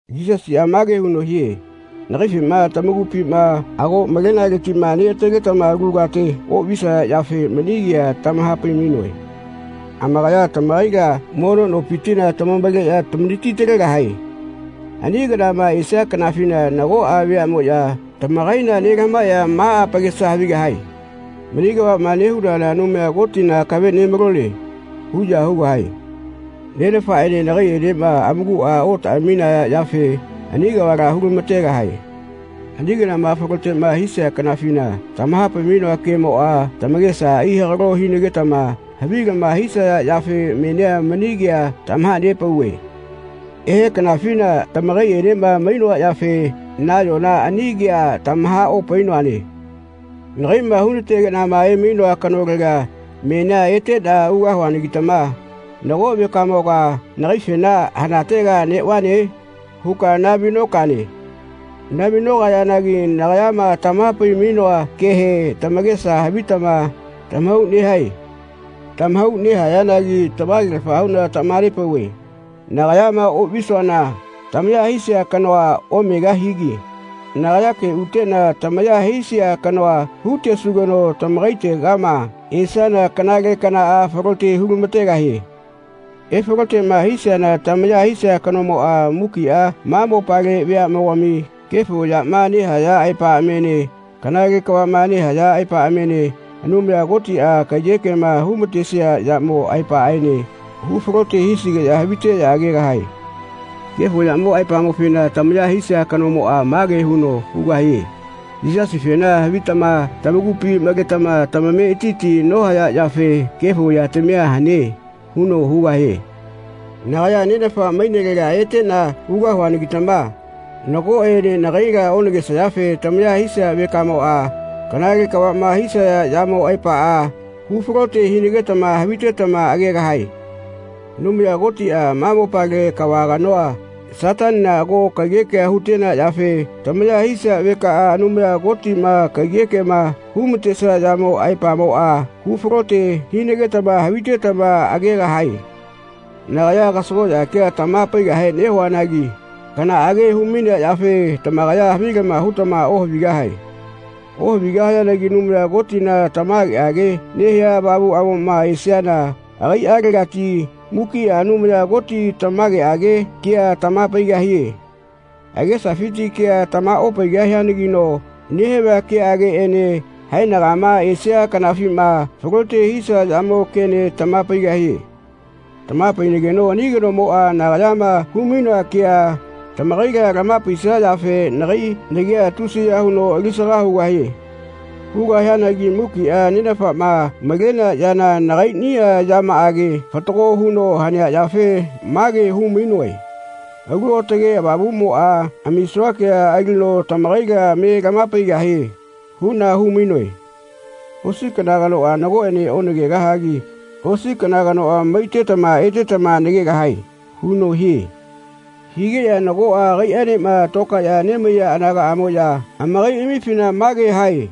Yisasiꞌa mage huno hie “Nagaifema tamakupima ago malenaletiꞌma neꞌataletama alu kate oꞌvisaya yafe mani kea tamaha-pai-mainoe. Amakaya tamakaila mono nopitila tamavaleꞌya tamanati-talegahae. Ani kanama esia kanafina nagoꞌa veaꞌmoꞌya tamakaila nelamahaeꞌya ma amakesa havigahae ‘Mani kavaꞌma nehunana Anumaya Kotina akave nemalone.’ huꞌya hugahae. Nenafaꞌene nagaiꞌenema amakuꞌa otaꞌaminaya yafe ani kavala hu-lama-tegahae. Ani kanama falote hisia kanafina tamaha-pai-mainoa kemoꞌa tamakesa ai-hagalo hinagetama havilama hisaya yafe menia mani kea tamaha-nepauve. Ehe kanafina tamakaiꞌenema mainoa yafe nayona ani kea tamaha-opainoane. Nagaiꞌma hu-na-tegeꞌna emainoa kanolega menia eteꞌna ugahuanagitama nago vekamoga nagaifena ‘Hanatega neꞌvane?’ huka nahavi-nokane. Nahavi-nokayanagi nagayama tamaha-pai-mainoa kehe tamakesa havitama tamahau nehae. Tamahau nehayanagi tamage-lafa huꞌna tamaha-nepauve nagayama oꞌvisuana tamaya hisia kanoa omegahigi nagayake uteꞌna tamaya hisia kanoa hu-tesugeno tamakaitegama esiana kanale kanaꞌa falote hu-lama-tegahie. Efaloteꞌma hisiana tamaya hisia kanomoꞌa mukiꞌa ma mopale veaꞌmogami kefo yama nehaya aepaꞌamiene kanale kavaꞌma nehaya aepaꞌamiene Anumaya Kotiꞌa kaiyekema hu-ma-tesia yamo aepaꞌaene hu-falote hisigeꞌya haviteꞌya agegahae. Kefo yamo aepamofena tamaya hisia kanomoꞌa mage huno hugahie ‘Yisasifena havitama tamakupi maletama tamametiti nohaya yafe kefo yatamia hane.’ huno hugahie. Nagaya Nenafa mainelega eteꞌna ugahuanagitama nagoꞌene nagaila onagesayafe tamaya hisia vekamoꞌa kanale kavaꞌma hisaya yamo aepaꞌa hu-falote hinagetama havitetama agegahae. Anumaya Kotiꞌa ma mopale kava kanoa, Satanina, ago kaiyekea hu-tenea yafe tamaya hisia vekaꞌa Anumaya Kotiꞌma kaiyekema hu-ma-tesia yamo aepamoꞌa hu-falote hinagetama havitetama agegahae. Nagaya kasagoꞌya kea tamaha-paigahe nehuanagi kanaꞌage hu-mainea yafe tamakaya havilama hutama ohavigahae. Ohavigahayanagi Anumaya Kotina tamageꞌage nehia Avamuꞌamoꞌma esiana agaiꞌalegati mukiꞌa Anumaya Koti tamageꞌage kea tamaha-paigahie. Agesafiti kea tamaha-opaigahianagino nehavia keꞌageꞌene haenagama esia kanafima falote hisia yamo kene tamaha-paigahie. Tamaha-painageno ani kanomoꞌa nagayama hu-mainoa kea tamakaila tamaha-paisia yafe nagai nagia tusiya huno ali-saga hugahie. Hugahianagi mukiꞌa Nenafaꞌma malenea yana nagaiꞌniꞌa yamaꞌage fatago huno hanea yafe mage hu-mainoe ‘Alu Aotage Avamuꞌmoꞌa amisua kea alino tamakaila me lamaha-paigahie.’ huꞌna hu-mainoe.” “Osi kana kanoꞌa nagoꞌene onagegahagi osi kana kanoꞌa maitetama etetama nagegahae.” huno hie. Higeꞌya nagoꞌa agaiꞌaenema tokaeꞌya nemaiya anagaꞌamoꞌya amakaiꞌamifina mage hae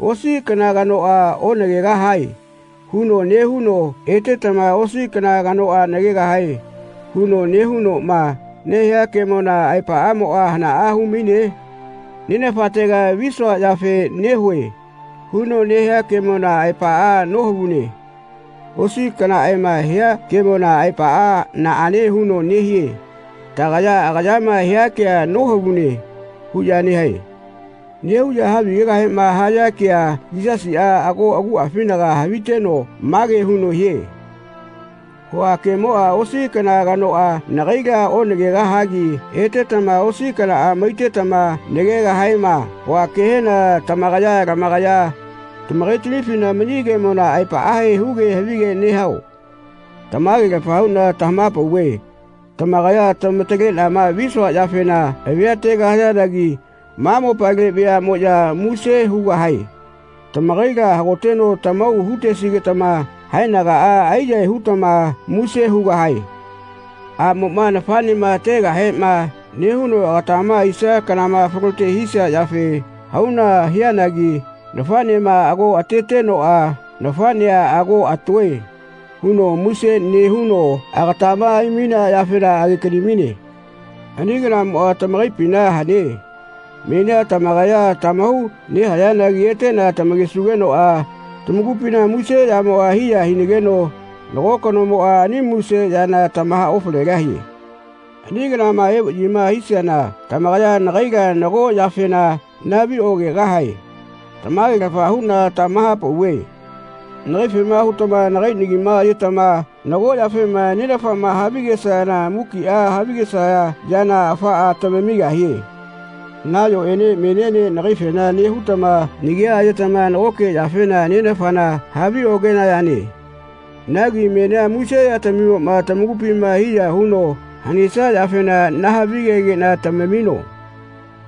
“Osi kana kanoꞌa onagegahae huno nehuno etetama osi kana kanoꞌa nagegahae huno nehunoꞌma nehia kemona aepaꞌamoꞌa hanaꞌa hu-maine? ‘Nenafatega visua yafe nehue.’ huno nehia kemona aepaꞌa nohavune. Osi kanaꞌaema hia kemona aepaꞌa naꞌane huno nehie? Tagaya agayama hia kea nohavune.” huꞌya nehae. Nehuꞌya havigegahema haya kea Yisasiꞌa ago aguꞌafinaga haviteno mage huno hie “Hua kemoꞌa ‘Osi kana kanoꞌa nagaila onagegahagi etetama osi kanaꞌa maitetama nagegahaema.’ hua kehena tamakaya lamakaya tamakaitamifina mani kemona aepaꞌahe huge havige nehao? Tamage-lafa huꞌna lamaha-pauve tamakaya tamataleꞌnama visua yafena avia ategahayanagi ma mopale veaꞌmoꞌya muse hugahae. Tamakaila hagoteno tamahau hu-tesigetama haenagaꞌa ai-yahae hutama muse hugahae. Aꞌmoꞌma nafaꞌnema ategahema nehuno agatama aisia kana falote hisia yafe hauna hianagi nafaꞌnema ago atetenoꞌa ‘Nafaꞌnea ago atoe.’ huno muse nehuno agatama ai-mainea yafena age-kani-maine. Ani kanamoꞌa tamakaipina hane. Menia tamakaya tamahau nehayanagi eteꞌna tamakesugenoꞌa tamakupina muse yamoꞌa hiya hinageno nago kanomoꞌa ani muse yana tamaha-ofalegahie. Ani kanama evaꞌyima hisiana tamakaya nagaila nago yafena nahavi-okegahae. Tamage-lafa huꞌna tamaha-pauve nagaifema hutama nagai nagima ayetama nago yafema Nenafama havigesayana mukiꞌa havigesaya yana afaꞌa tamamigahie. Nayoꞌene meniene nagaifena nehutama nagia ayetama nagoke yafena Nenafana haviokenayane. Nagi menia muse yatamimoꞌma tamakupina hiya huno hanesia yafena nahavigegeꞌna tamamino.”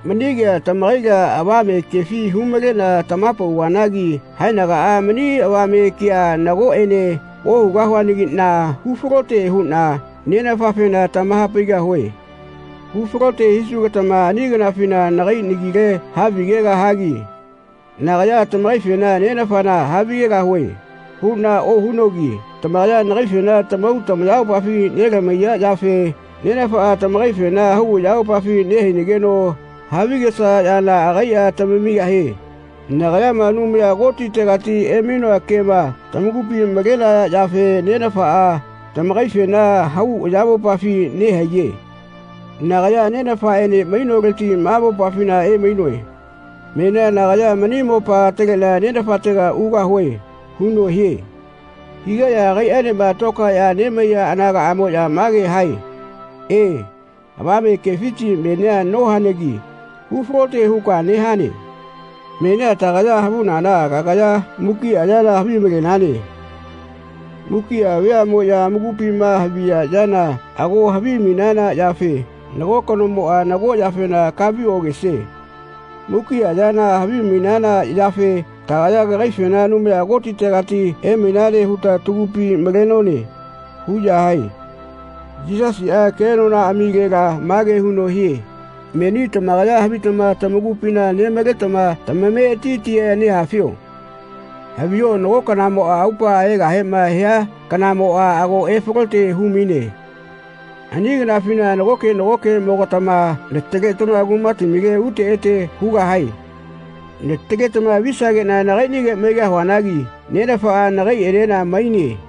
“Mani kea tamakaila avame kefi hu-maleꞌna tamaha-nepauvanagi haenagaꞌa mani avame kea nagoꞌene ohugahuanagiꞌna hu-falote huꞌna Nenafafena tamaha-paigahue. Hu-falote hisugetama ani kanafina nagai nagile havigegahagi nagaya ‘Tamakaifena Nenafana havigegahue.’ huꞌna ohunogi tamakaya nagaifena tamahau tamayamopafi nelamahaiya yafe Nenafaꞌa tamakaifena hau ayamopafi nehainageno havigesaya yana agaiꞌa tamamigahie. Nagayama Anumaya Kotitegati emainoa kema tamakupi malenaya yafe Nenafaꞌa tamakaifena hau ayamopafi nehaiye. Nagaya Nenafaꞌene mainoleti ma mopafina emainoe. Menia nagaya mani mopa ataleꞌna Nenafatega ugahue.” huno hie. Higeꞌya agaiꞌaenema tokaeꞌya nemaiya anagaꞌmoꞌya mage hae “E, avame kefiti menia nohanagi hu-falote huka nehane. Menia tagaya havunana kagaya mukiꞌa yana havimalenane. Mukiꞌa veaꞌmoꞌya amakupima haviya yana ago havimainana yafe nago kanomoꞌa nago yafena kahavi-okesie. Mukiꞌa yana havimainana yafe tagaya kagaifena Anumaya Kotitegati emainane huta tagupi malenone.” huꞌya hae. Yisasiꞌa kenonaꞌamilela mage huno hie “Meni tamakaya havitama tamakupina nemaletama tamametiti nehafio? Haviho nago kanamoꞌa aupaꞌa egahema hia kanamoꞌa ago efalote hu-maine. Ani kanafina nagoke nagokeꞌmogatama nataletama kumatamile ute ete hugahae. Nataletama visageꞌna nagaiꞌnige maigahuanagi Nenafaꞌa nagaiꞌenena maine.